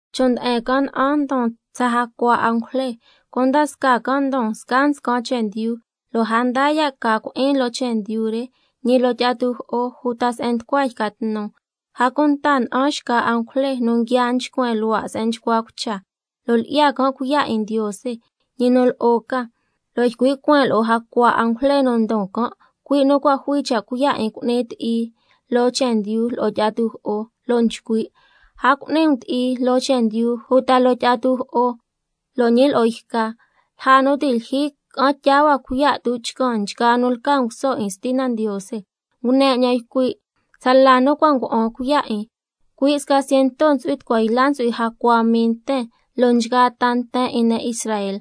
Chon' nde'en can' na'an ndon tsa jacua angujle, cunda scaa can' ndon scaa nscan chendyu, lo' a ndaa ya' ca cui'in loo chendyu re, ñi loo tyi'a tujo'o, uta se'en nducua yca tnu. A cunta na'an xca angujle nu nguia nchcuen luhua' se'en nchcua cucha, lo' lyi'ya can' cuiya' 'in Ndiose, ñi nu lo'o ca, lo' ycui' cueen lo'o jacua angujle nu ndon can', cui' nu cua' jui cha' cuiya' 'in cu'ni ti'i loo chendyu lo'o tyi'a tujo'o, lo' nchcui': A cu'ni um ti'i loo chendyu uta loo tyi'a tujo'o lo' ñi lo'o yca, lja nu ti' lyijyi ca'an tyaa na cuiya' tuchcan nchgaa nu lca nguso 'in Stina Ndiose. Ngune 'ñan ycui' tsala nu cua' nga'an cuiya' 'in: Cui' sca ciento ntsu'hui tucua yla ntsu'hui jacua mii nten loo nchgaa ta nten 'in ne' Israel.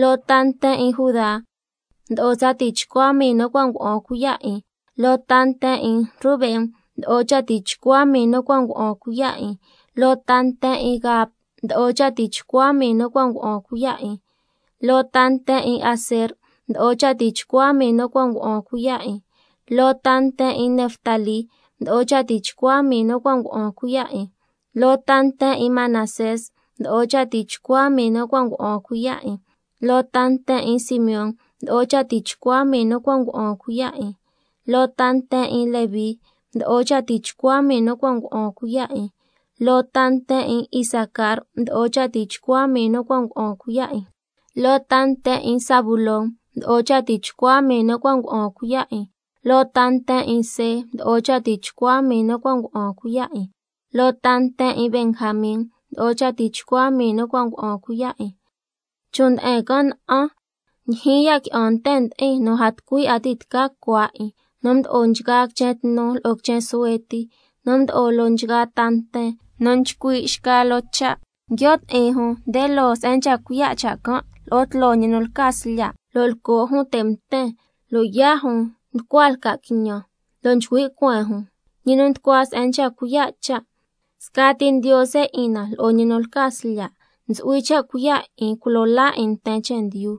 Loo ta nten 'in Judá mdo'o tsa tichcua mii nu cua' nga'an cuiya' 'in. Loo ta nten 'in Rubén mdo'o cha tichcua mii nu cua' nga'an cuiya' 'in. Loo ta nten 'in Gad mdo'o cha tichcua mii nu cua' nga'an cuiya' 'in. Loo ta nten 'in Aser mdo'o cha tichcua mii nu cua' nga'an cuiya' 'in. Loo ta nten 'in Neftalí mdo'o cha tichcua mii nu cua' nga'an cuiya' 'in. Loo ta nten 'in Manasés mdo'o cha tichcua mii nu cua' nga'an cuiya' 'in. Loo ta nten 'in Simeón mdo'o cha tichcua mii nu cua' nga'an cuiya' 'in. Loo ta nten 'in Leví mdo'o cha tichcua mii nu cua' nga'an cuiya' 'in. Loo ta nten 'in Isacar mdo'o cha tichcua mii nu cua' nga'an cuiya' 'in. Loo ta nten 'in Zabulón mdo'o cha tichcua mii nu cua' nga'an cuiya' 'in. Loo ta nten 'in See mdo'o cha tichcua mii nu cua' nga'an cuiya' 'in. Loo ta nten 'in Benjamin mdo'o cha tichcua mii nu cua' nga'an cuiya' 'in. Chon' nde'en can' na'an, ndyijyin ya' qui'an nten ndi'in nu a tucui 'a ti' tca cua 'in, nu mdo'o nchgaa quichen tnu lo'o quichen suhue ti, nu mdo'o loo nchgaa ta nten, nu nchcui' xca loo cha', nguio' ti'in jun nde loo se'en nchca cuiya' cha' can' lo'o tloo ñi nu lca Slya', lo' lco' jun te' mten lo' yaa' jun nducua lca' quiñan, lo' nchcui' cueen jun: Ñi nu nducua se'en nchca cuiya' cha', scati Ndiose 'in na lo'o ñi nu lca Slya' ntsu'hui cha' cuiya' 'in culo laa ñi 'in nten chendyu.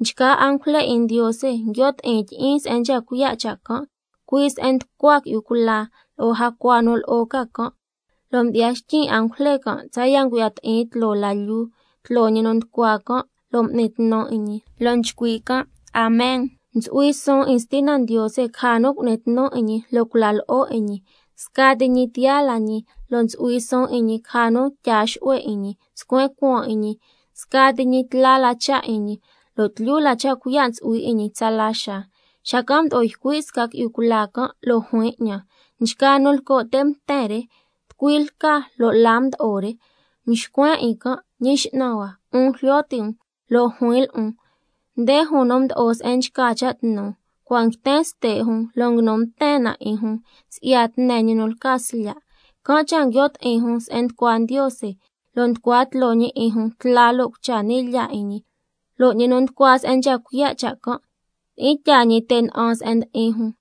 Nchgaa angujle 'in Ndiose nguio' ti'in tyi'iin se'en can', cui' se'en nducua qui'yu cula lo'o jacua nu lo'o ca can', lo' mdyi'ya xtyin' angujle can' tsaya' ngu'ya ti'in tloo la lyuu, cui' se'en nchca cuiya' cha' can', lo' m'ni tnu 'in Ndiose, lo' nchcui': Amen. Ntsu'hui suun 'in Stina Ndiose caja nu cu'ni tnu 'in ñi lo' cula lo'o 'in ñi, scati ñi tiyaa la ñi, lo' ntsu'hui suun 'in ñi caja nu tyaa xu'hue 'in ñi, scuen cuaan 'in ñi, scati ñi tla la cha' 'in ñi, lo' tlyu la cha' cuiya' ntsu'hui 'in ñi tsala xaa. Xacan' mdo'o ycui' sca qui'yu cula can', lo' juin 'ñan: Nchgaa nu lco' te' mten re, ¿tucui lca lo' la mdo'o re? Mxcuen 'in can': Ñi X'nan hua, 'un jlyo ti' um. Lo' juin lo'on: Nde nu mdo'o lja se'en nchca cha' tnu, cua' nguiten ste' re lo' nguinu mten na 'in si'ya tne ñi nu lca Slya'. Can' cha' nguio' ti'in jun se'en nducua Ndiose, lo' nducua tloo ñi 'in jun tla lo' cucha ni' lyaa 'in ñi, lo' ñi nu nducua se'en nchca cuiya' cha' can', tyi'in tyaa te' na'an 'in se'en ndi'in jun.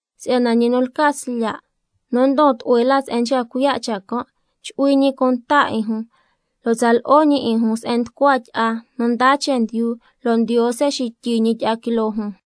si'yana ñi nu lca Slya' nu ndon tlu'hue la lja se'en nchca cuiya' cha' can', —chu'hui ñi cunta 'in lo' tsa lo'o ñi 'in se'en nducua tyi'a nu ndaa chendyu, lo' Ndiose xityi ñi tyi'a quiloo can'—.